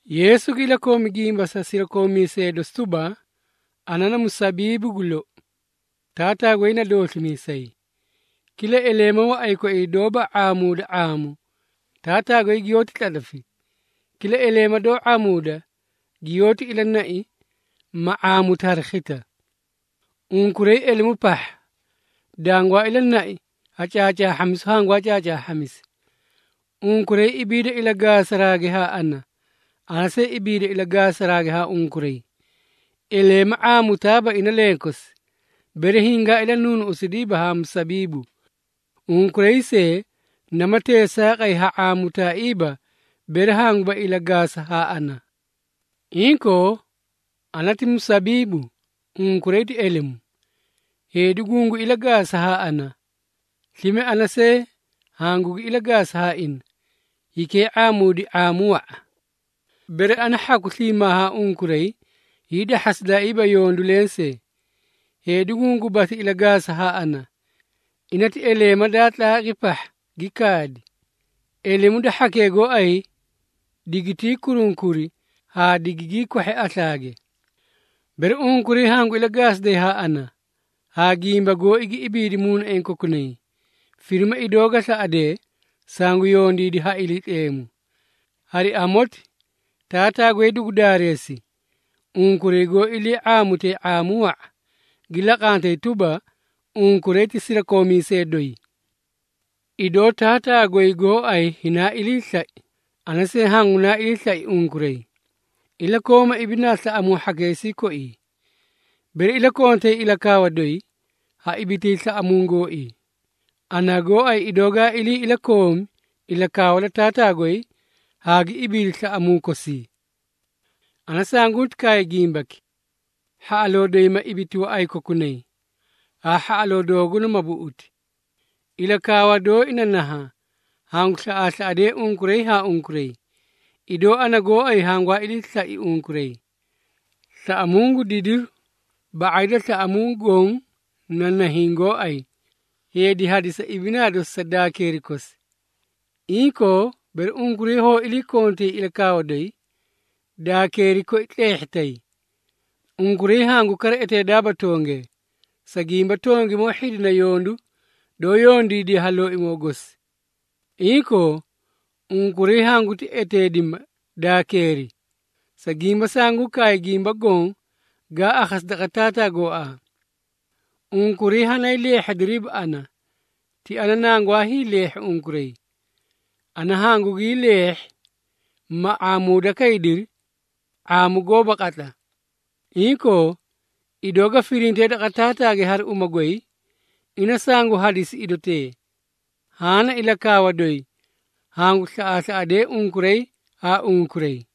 Yeesu gi ilakoomi gimba sa sirakoomiisee dosi tuba, “Ana na musabiibu gu lou, Taataa goy na dooslimiisay. Kila eleema waꞌay koii doóba ⁄aamuuda ⁄aamu, Taataa goy giyoóti tlatlafi. Kila eleema doó ⁄aamuuda, giyoóti ilanai, ma ⁄aamuti hari khisla. Unkuray elemu pahha, dangwaa ilanai ha caacaahhamisu hangwaa caacaahhamisi. Unkuray ibiida ilagaasaraage haa ana, ana see ibiida ilagaasaraage haa unkuray. Eleema ⁄aamutaaba ina lenkosi, bere hingaa ilanuunuꞌusidiiba haa musabiibu. Unkuray see, nama teesaaqay ha ⁄aamutaaiiba bere hanguba ilagaasa haa ana. Inkoo, ana ti musabiibu, unkuray ti elemu. Heedi gungu ilagaasa haa ana, slime ana see hangugi ilagaasa haa ina, hikee ⁄aamuudi ⁄aamu wa⁄a. Bere ana hhaku sliimaa haa unkuray hiidahhasidaaiiba yondu lensee. Heedi gungubasli ilagaasa haa ana, ina ti eleema daa tlaaqi pahha gi kaadi. Elemu da hhakee gooay, digitii kurunkuri haa digigii kwahhi aslaage. Bere unkuray hangu ilagaasiday haa ana, haa gimba gooi gi ibiidi muunaiĩ kokunay, firima idoo ga slaꞌadee, sangu yondiidi ha Iliitleemu. Hari amoti, Taataa goy dugu daareesi, unkuray goó ilii ⁄aamutee ⁄aamu wa⁄a, gi laqantay tuba, unkuray ti sirakoomiisee doyi. Idoo Taataa goy gooay hinaa ilii slai, ana see hangunaa ilii slai unkuray. Ilakooma ibinaa slaꞌamuu hhakeesii koi. Bere iliikontay ilakaawa doyi, ha ibitay slaꞌamuu gooii, ana gooay idoo gaa ilii ilakoomi ilakaawa da Taataa goy haa gi ibiidi slaꞌamuu kosii. Ana sanguuti kaay gimbaki, hhaꞌaloo doyi ma ibiti waꞌay kokunay, haa hhaꞌaloo dooguna ma buꞌuti. Ilakaawa dooi na nahaã, hangu slaꞌaaslaꞌadee unkuray haa unkuray, idoo ana gooay hangwaa ilii slai unkuray. Slaꞌamuu gu didiru ba⁄ay da slaꞌamuu goõ na nahiĩ gooay, heedi hadisa ibinaa dosi sa daakeeri kosi. Inkoo, bere unkuray hoó iliikontay ilakaawa doyi, daakeeri koi tleehhitay. Unkuray hangu kara eteedaaba tongee, sa gimba tongimoo hhidina yondu doó yondiidiye ha looay gosi. Inkoo, unkuray hanguti eteedima daakeeri, sa gimba sanguu kaay gimba goõ gaa akhasi daqa Taataa gooaa. Unkuray hanay leehhediriiba ana, ti ana nangwaa hiileehhi unkuray. Ana hangugii leehhi, ma ⁄aamuuda kaydiri ⁄aamu goóba qatla. Inkoo, idoo ga firintee daqa Taataage hari uma goy, ina sangu hadisi idotee. Haã na ilakaawa doyi, hangu slaꞌaaslaꞌadee unkuray haa unkuray.”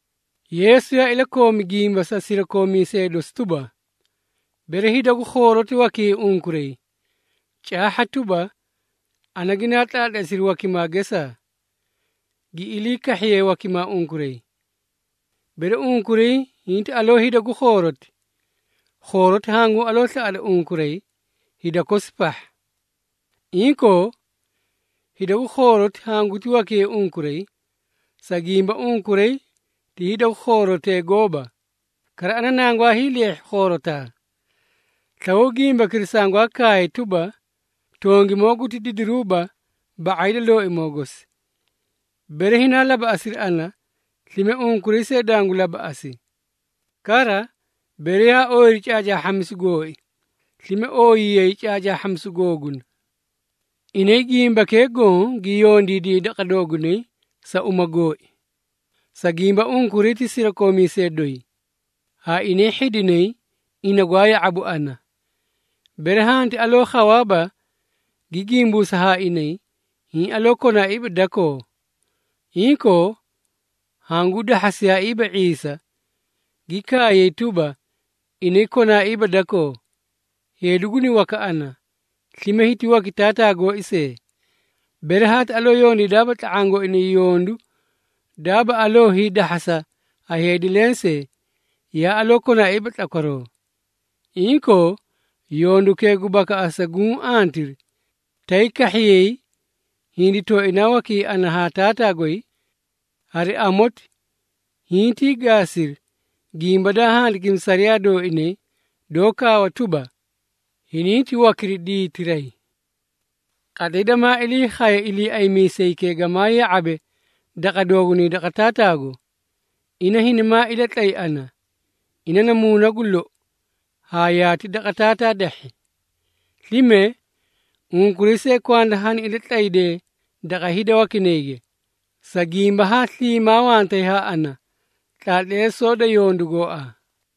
Yeesu yaa ilakoomi gimba sa sirakoomiisee dosi tuba, “Bere hida gu khooroti wakiyay unkuray, caahha tuba, ana ginaa tlaatleesiri wakimaa gesaa, gi ilii kahhiyee wakimaa unkuray. Bere unkuray hinti aloo hida gu khooroti, khooroti hanguu aloo slaꞌada unkuray hida kosi pahha. Inkoo, hida gu khooroti hanguti wakiyay unkuray, sa gimba unkuray ti hida gu khoorotee gooba, kara ana nangwaa hiileehhi khoorotaa. Slawaw gimbakira sangwaa kaay tuba, ‘Tongimoo guti didiruuba ba⁄ay da looimoo gosi.’ Bere hinaa labaꞌasiri ana, slime unkuray see dangu labaꞌasi. Kara, bere yaa ooyiri caacaahhamisu gooi, slime ooyiyayi caacaahhamisu googuna. Inay gimbakee goõ gi yondiidiyay daqa doogunay sa uma gooi, sa gimba unkuray ti sirakoomiisee doyi, haa inay hhidinay ina gwaa ya⁄abu ana. Bere hanti aloo khawaaba gi gimbuusa haa inay, hiĩ aloo konaaiiba dakoo. Inkoo, hanguu dahhasiyaaiiba ⁄iisa, gi kaayay tuba, inay konaaba dakoo. Heedi guni waka ana, slime hiti waki Taataa gooi see. Bere haati aloo yondiidaaba tla⁄aã gooinay yondu daaba aloo hiidahhasa ha heedi lensee, yaa aloo konaaiiba tlakwaroo. Inkoo, yondukee gu bakaꞌasa guũ antiri, tay kahhiyay hindi tooinaa wakiyay ana haa Taataa goy. Hari amoti, hintii gaasiri, gimba daa handikimi sariyaa dooinay, doó kaawa tuba, ‘Hininti wakiri diitiray.’ Qatlay damaa ilii khaye Iliiaymiisaykee gamaa ya⁄abe daqa doogunay daqa Taataago, ina hinimaa ilatlay ana. Ina na Muuna gu lou, haa yaati daqa Taataa dahhi. Slime, unkuray see kwanda hani ilatlaydee daqa hida wakinayge, sa gimba haa sliimaa wantay haa ana tlaatleesoo da yondu gooaa.”